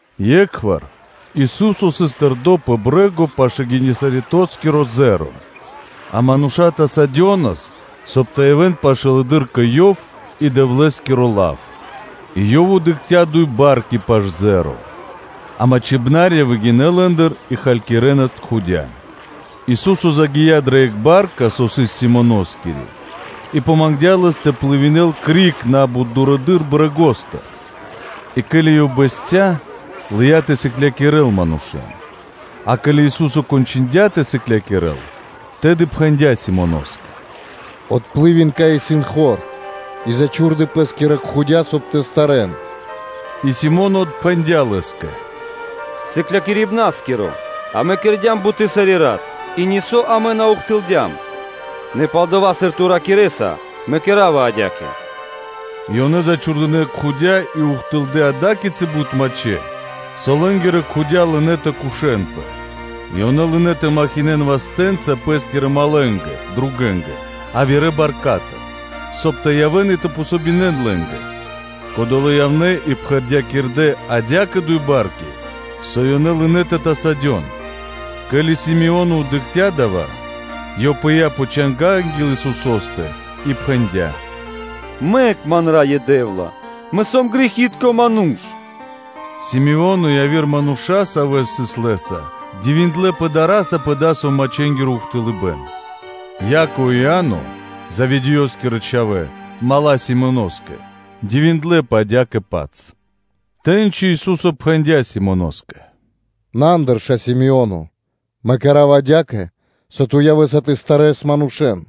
Екхвар Ису́со сыс тэрдо́ пэ брэ́го пашы́л Генисаретоскиро зеро (озеро), а мануша́ тасавэнаспэ, соб (кай) тэ явэ́н пашылэды́р кэ Ёв и кэ Дэвлэ́скиро лав; и Ёв дыкхця́ дуй барки (лодки) пашы́л зеро (озеро); а мачхибнарья выгинэ́ лэ́ндыр и халькирэнас кхудя (сети). Ису́со загия́ дрэ екх ба́рка, сави́ сыс Симоноскири, и мангдя́ Лэс тэ плывинэл (тэ дэл плима) криг на́бут дурэды́р брэгостыр; и ке́ли Ёв бэсця́, лыя́ тэ сыклякирэ́л манушэ́н. А ке́ли Ису́со кончындя тэ сыклякирэ́л, тэды пхэндя́ Симоноскэ: “Отплывин (дэ плима дурэдыр), кай исын хор и зачхурдэ пэ́скирэ кхудя, соб (кай) вари-со тэ старэн.” И Си́моно отпхэндя́ Лэ́скэ: “Сыклякирибна́скиро! Амэ кэрдя́м буты́ сари́ рат, и нисо́ амэ на ухтылдям; нэ пал-дова́, сыр Ту ракирэ́са, мэ кэра́ва адя́кэ.” И ёнэ зачхурдынэ кхудя и ухтылдэ́ ада́кицы бут мачхэ́, со лэ́нгирэ кхудя лынэ́ тэ кушэн. И ёнэ лынэ́ тэ сыкавэ́н вастэ́нца пэ́скирэ малэнгэ (другэнгэ) явирэ баркатыр, соб (кай) тэ явэ́н и тэ дзн васт лэ́нгэ; кодолэ́ явнэ́ и пхэрдякирдэ адя́кэ дуй барки, со ёнэ лынэ́ лынэ́ тэ тасадён. Ке́ли Си́моно дыкхця́ дава́, ёв пыя́ пэ анги́л Исусо́стэ пэ чанга́ и пхэндя́: “Мэк ман, Раё Дэ́вла, мэ сом грэхи́тко ману́ш!” Си́моно и яви́р мануша́, савэ́ сыс Лэ́са, дивиндлэ́пэ дара́са пэ дасаво мачхэнгиро ухтылыбэн; Яково и Иа́но, Заведеёскирэ чхавэ́, мала́ Симоноскэ, дивиндлэ́пэ адя́кэ-паць. Тэ́ньци Ису́со пхэндя́ Симоноскэ: “На, андырша, Симоне, Мэ кэра́ва адя́кэ, со ту явэ́са тэ старэс манушэ́н.”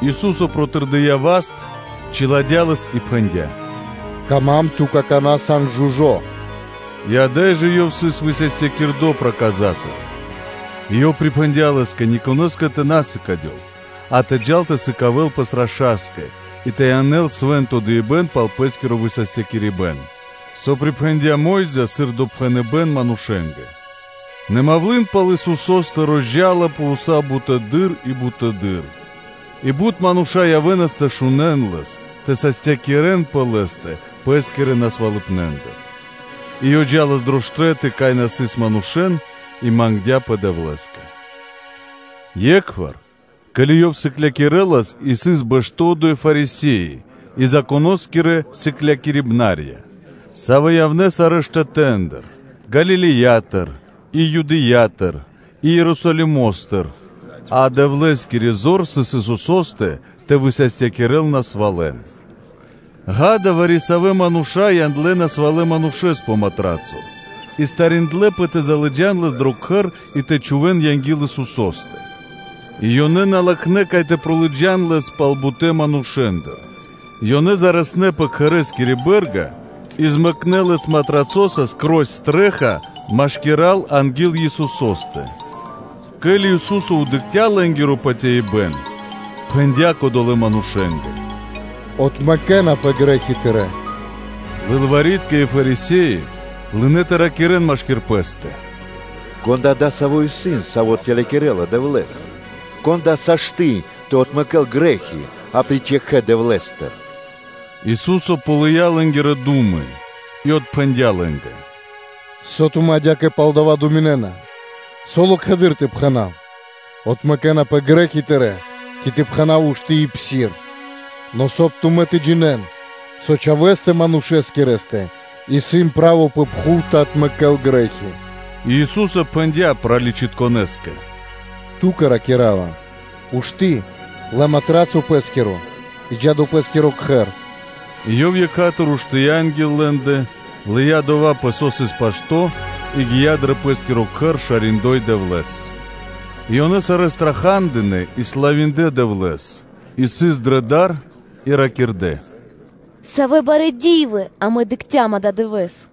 Ису́со протырдыя́ васт, чиладя́ лэс и пхэндя́: “Кама́м, ту какана́ сан жужо́ (чысто).” И ада́й жэ ёв сыс высастякирдо проказатыр. И Ёв припхэндя́ Лэ́скэ никонэ́скэ тэ на сыкадёл, а тэ джал тэ сыкавэ́л пэс раша́скэ и тэ янэл свэ́нто дыибэ́н пал пэ́скиро высастякирибэн, со припхэндя́ Мо́йза, сыр допхэныбэ́н манушэ́нгэ. Нэ мавлы́н пал Исусо́стэ розджалапэ уса́ буты́р, и буты́р, и бут бут мануша́ явэ́нас тэ шунэ́н Лэс, тэ састякирэнпэ Лэ́стэ пэ́скирэ насвалыпнэндыр. И Ёв джа́лас пир штэ́ты, кай на сыс мануша́, и мангдя́пэ Дэвлэ́скэ. Екхвар, ке́ли Ёв сыклякирэлас и сыс бэштэ́ одо́й Фарисе́и и Законо́скирэ сыклякирибнарья, савэ́ явнэ́ сарэ́ штэтэ́ндыр Галилеятыр и Юдэя́тыр и Ерусалимо́стыр, а Дэвлэ́скири зор сыс Исусо́стэ тэ высастякирэл насвалэн, ґа́да, вари-савэ́ мануша́ яндлэ́ насвалэ манушэ́с пэ матрацо и причхудэ зор (стариндлэпэ) тэ залыджан лэс дро кхэр и тэ чхувэ́н анги́л Исусо́стэ; и, сыр ёнэ на латхнэ́, кай тэ пролыджан лэс пал бутэ́ манушэ́ндэ, то ёнэ зарэснэ пэ кхэрэ́скири бэ́рга и змэкнэ лэс матрацоса пир (скрозь) стрэ́ха (чхаки́н) машкира́л анги́л Исусо́стэ. Ке́ли Ису́со дыкхця́ лэ́нгиро патяибэ́н, пхэндя́ кодолэ́ манушэ́скэ: “Отмэкэнапэ грэ́хи тырэ́!” Лылвари́тка и Фарисе́и лынэ́ тэ ракирэ́н машки́р пэ́стэ: “Кон да дасаво исын, Саво́ тэлякирэла Дэвлэ́с? Кон да сашты́ (могинэ́ла) тэ отмэкэ́л грэ́хи апри́ч екхэ Дэвлэ́стэ?” Ису́со ґалыя́ лэ́нгирэ ду́мы и отпхэндя́ лэ́нгэ: “Со тумэ́ адя́кэ пал дава́ думинэ́на? Со локхэды́р тэ пхэна́в: ‘Отмэкэнапэ грэ́хи тырэ́’, ци тэ пхэна́в: ‘Ушты́ и псир?’ Нэ, соб (кай) тумэ́ тэ джинэ́н, со Чхавэ́стэ Манушэскирэстэ исын право пэ пхув тэ отмэкэ́л грэ́хи”, и Ису́со пхэндя́ праличытконэскэ: “Ту́кэ ракира́ва: Ушты́, лэ матрацо пэ́скиро и джа́ дро пэ́скиро кхэр.” И ёв екха́тыр (сра́зу) уштыя́ анги́л лэ́ндэ, лыя́ дова́, пэ со сыс пашто́, и гия́ дро пэ́скиро кхэр, шариндой Дэвлэ́с. И ёнэ сарэ́ страха́дынэ и славиндлэ Дэвлэ́с: и сыс дрэ дар, и ракирдэ́: “Савэ барэ́ ди́вы амэ дыкхцям ададывэ́с.”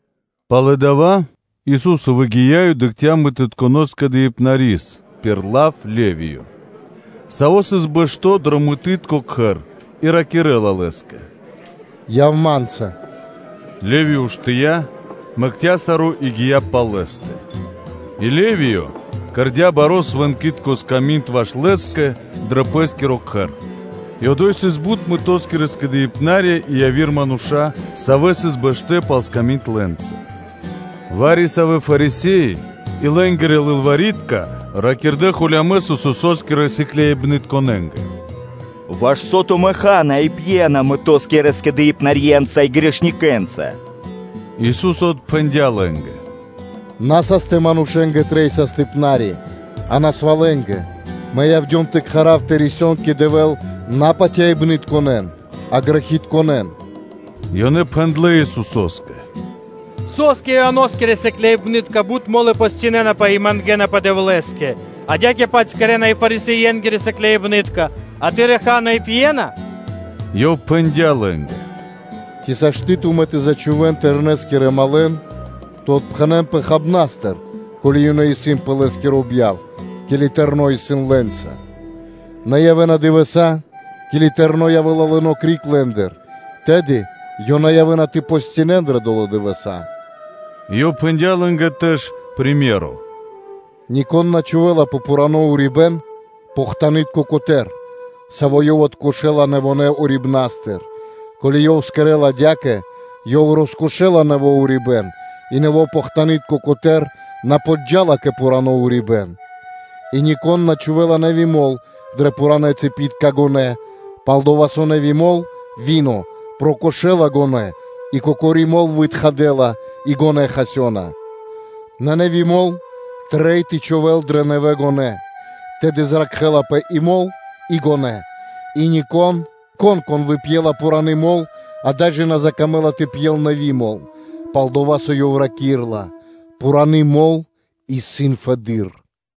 Пало́ дава́ Ису́со выгия́ и дыкхця́ мытытконэ (таксытконэ) скэдыибнарис пир лав Левиё, саво́ сыс бэшто́ дро мытытко кхэр, и раки́рла лэ́скэ: “Яв Ма́нца”, Левиё уштыя́, мэкця́ саро́ и гия́ пал Лэ́стэ. И Левиё кэрдя́ баро́ свэнкитко сками́нд ваш Лэ́скэ дро пэ́скиро кхэр: и одо́й сыс бут мытоскирэ скэдыибнарья и яви́р мануша́, савэ́ сыс бэштэ́ пал сками́нд лэ́нца. Вари-савэ́ Фарисе́и и лэ́нгирэ лылвари́тка ракирдэ́ холямэс Исусо́скирэ сыкляибнытконэ́нгэ: “Ваш со тумэ́ ха́на и пьена мытоскирэ скэдыибнарьенца и грэхэнгирэнца?” Ису́со отпхэндя́ лэ́нгэ: “На састэ манушэ́нгэ трэй састыпнари (докторо), а насвалэнгэ.” Мэ явдём тэ кхарав тэ рисён кэ Дэвэ́л на патяибнытконэн, а грэхэнгирэн.” Ёнэ пхэндлэ́ Исусо́скэ: “Со́скэ Ианоскирэ сыкляибны́тка бут мо́лы постинэнапэ и мангэ́напэ Дэвлэ́скэ; адя́кэ-паць кэрэ́на и Фарисее́нгирэ сыкляибны́тка, а Тырэ́ сыкляибны́тка ха́на и пьена? Ёв пхэндя́ лэ́нгэ: “Ци могинэ́на (сашты́) тумэ́ тэ зачхувэн Тэрнэскирэ малэн (другэн) тэ отпхэнэнпэ хабнастыр, ко́ли ёнэ исын пэ Лэ́скиро бьяв, ке́ли Тэрно́ (Жэнихо) исын лэ́нца? Нэ явэ́на дывэса́, ке́ли Тэрно́ явэ́ла лыно́ криг лэ́ндыр, тэды ёнэ явэ́на тэ постинэн дрэ долэ́ дывэса́.” И Ёв пхэндя́ лэ́нгэ приме́ро (сыкаибэ́н): “Нико́н на чхувэ́ла пэ пхурано́ урибэ́н похтанытко котэ́р (лапико), саво́ ёв откошэла нэвонэ́ урибнастыр; ко́ли ёв кэрэ́ла адя́кэ, ёв роскошэла нэво́ урибэ́н, и нэво́ похтанытко котэ́р на подджа́ла кэ пхурано́ урибэ́н. И нико́н на чхувэ́ла нэви́ мол дрэ пхуранэ́ цыпитка гонэ́: пал-дова́ со нэви́ мол (вино) прокошэла гонэ́ и кокори мол вытхадэла, и гонэ́ хасёна. Нэ нэви́ мол трэй тэ чхувэ́л дрэ нэвэ гонэ́, тэды зракхэ́лапэ и мол, и гонэ́. И нико́н, кон выпьела пхураны мол, ада́й жэ на закамэ́ла тэ пьел нэви́ мол; пал-дова́ со ёв раки́рла: “Пхураны мол исын фэды́р”.